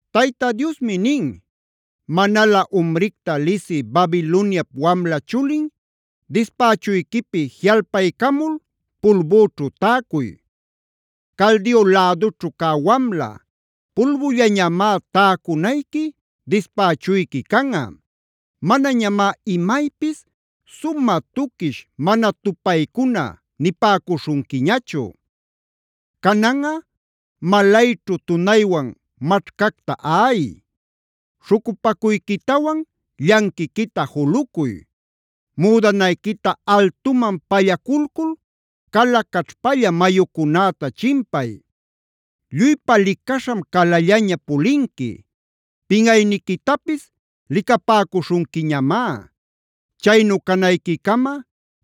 Tayta Diosmi nin: “Manalä umricta lisï Babiloniap wamla chulin, dispächuyquipi jiꞌalpaycamul pulbüćhu täcuy. Caldea lädućhu cä wamla, pulbullañamá täcunayqui, dispächuyqui canꞌa; manañamá imaypis ‘sumä tuquish, mana tupaycuna’ nipäcuśhunquiñachu. Cananꞌa malayćhu tunaywan maćhcacta aꞌay. Śhucupacuyquitawan llanquiquita julucuy; müdanayquita altuman pallaculcul cala caćhpalla mayucunäta chimpay. Lluypa licaśham calallaña pulinqui; pinꞌayniquitapis licapäcuśhunquiñamá. Chaynu canayquicama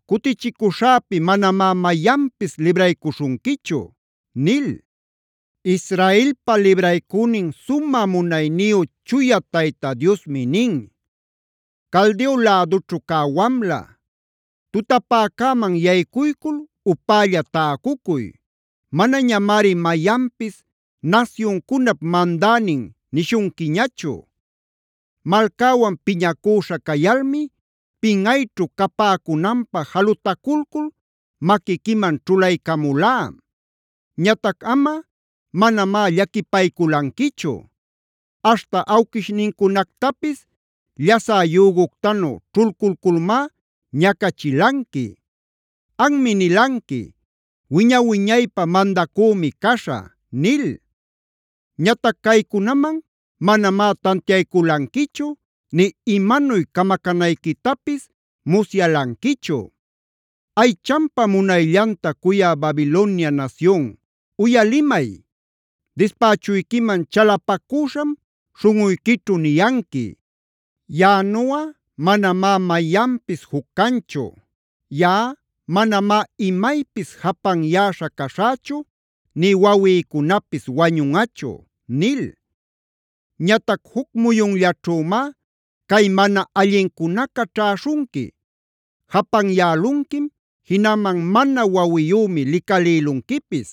cutichicüśhäpi manamá mayanpis libraycuśhunquichu” nil. Israelpa libraycünin sumä munayniyu Chuya Tayta Diosmi nin: “Caldeo lädućhu cä wamla, tutapäcäman yaycuycul upälla täcucuy. Manañamari mayanpis ‘nasyuncunap mandänin’ nishunquiñachu. “Malcäwan piñacüśha cayalmi pinꞌayćhu capäcunanpä jalutaculcul maquiquiman ćhulaycamulá. Ñatac amꞌa manamá llaquipayculanquichu; aśhta awquishnincunactapis llasä yüguctanu ćhulculculmá ñacachilanqui. Anmi nilanqui: ‘Wiña-wiñaypä mandacümi caśhä’ nil. Ñatac caycunaman manamá tantiayculanquichu nï imanuy camacänayquitapis musyalanquichu. “Aychanpa munayllanta cuyä Babiloniab nasyun, uyalimay; dispächuyquiman chalapacüśham śhunꞌuyquićhu niyanqui: ‘Yaꞌanuꞌa manamá mayanpis juc canchu. Yaꞌa manamá imaypis japanyäśha caśhächu nï wawïcunapis wañunꞌachu’ nil. Ñatac juc muyunllaćhümá cay mana allincunaca ćhäśhunqui:c Japanyälunquim jinaman mana wawiyümi licalïlunquipis.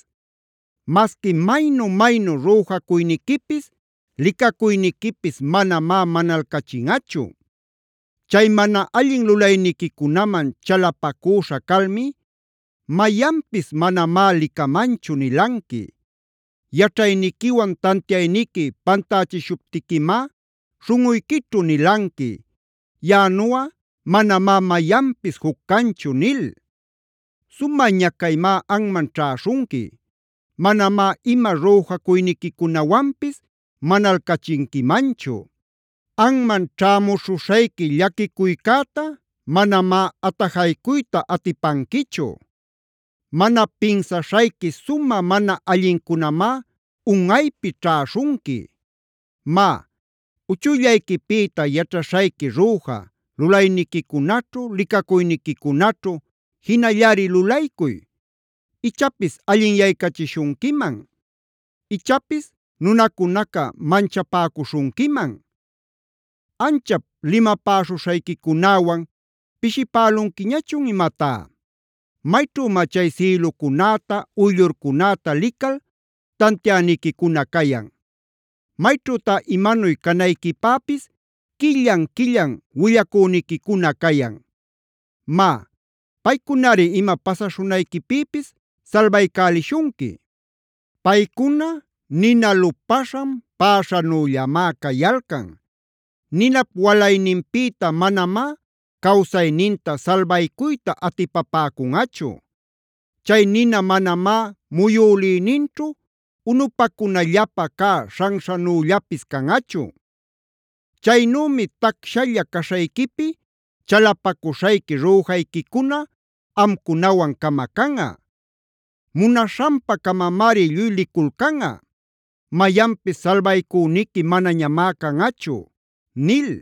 Masqui maynu-maynu rüjacuyniquipis, licacuyniquipis manamá manalcachinꞌachu. “Chay mana allin lulayniquicunaman chalapacüśha calmi: ‘Mayanpis manamá licamanchu’ nilanqui. Yaćhayniquiwan tantiayniqui pantächishuptiquimá śhunꞌuyquićhu nilanqui: ‘Yaꞌanuꞌa manamá mayanpis juc canchu’ nil. Sumä ñacaymá anman ćhäśhunqui; manamá ima rüjacuyniquicunawanpis manalcachinquimanchu. Anman ćhämuśhuśhayqui llaquicuycäta manamá atajaycuyta atipanquichu. Mana pinsaśhayqui sumä mana allincunamá unꞌaypi ćhäśhunqui. “Má, uchuyllayquipïta yaćhaśhayqui rüja, lulayniquicunaćhu, licacuyniquicunaćhu jinallari lulaycuy. Ichapis allinyaycachishunquiman; ichapis nunacunaca manchapäcuśhunquiman. ¿Anchap limapäśhuśhayquicunäwan pishipälunquiñachun imatá? ¿Mayćhümá chay sïlucunäta, uyllurcunäta lical tantiäniquicuna cayan? ¿Mayćhütá imanuy canayquipäpis quillan-quillan willacüniquicuna cayan? Má, paycunari ima pasaśhunayquipïpis salbaycälishunqui. Paycuna nina lupaśhan päśhänüllamá cayalcan. Ninap walayninpïta manamá cawsayninta salbaycuyta atipapäcunꞌachu. Chay nina manamá muyülïninćhu unupacunallapä cä śhanśhanüllapis canꞌachu. Chaynümi tacshalla caśhayquipi chalapacuśhayqui rüjayquicuna amcunawan camacanꞌa. Munaśhanpa-camamari lluy liculcanꞌa; mayanpis salbaycüniqui manañamá canꞌachu” nil.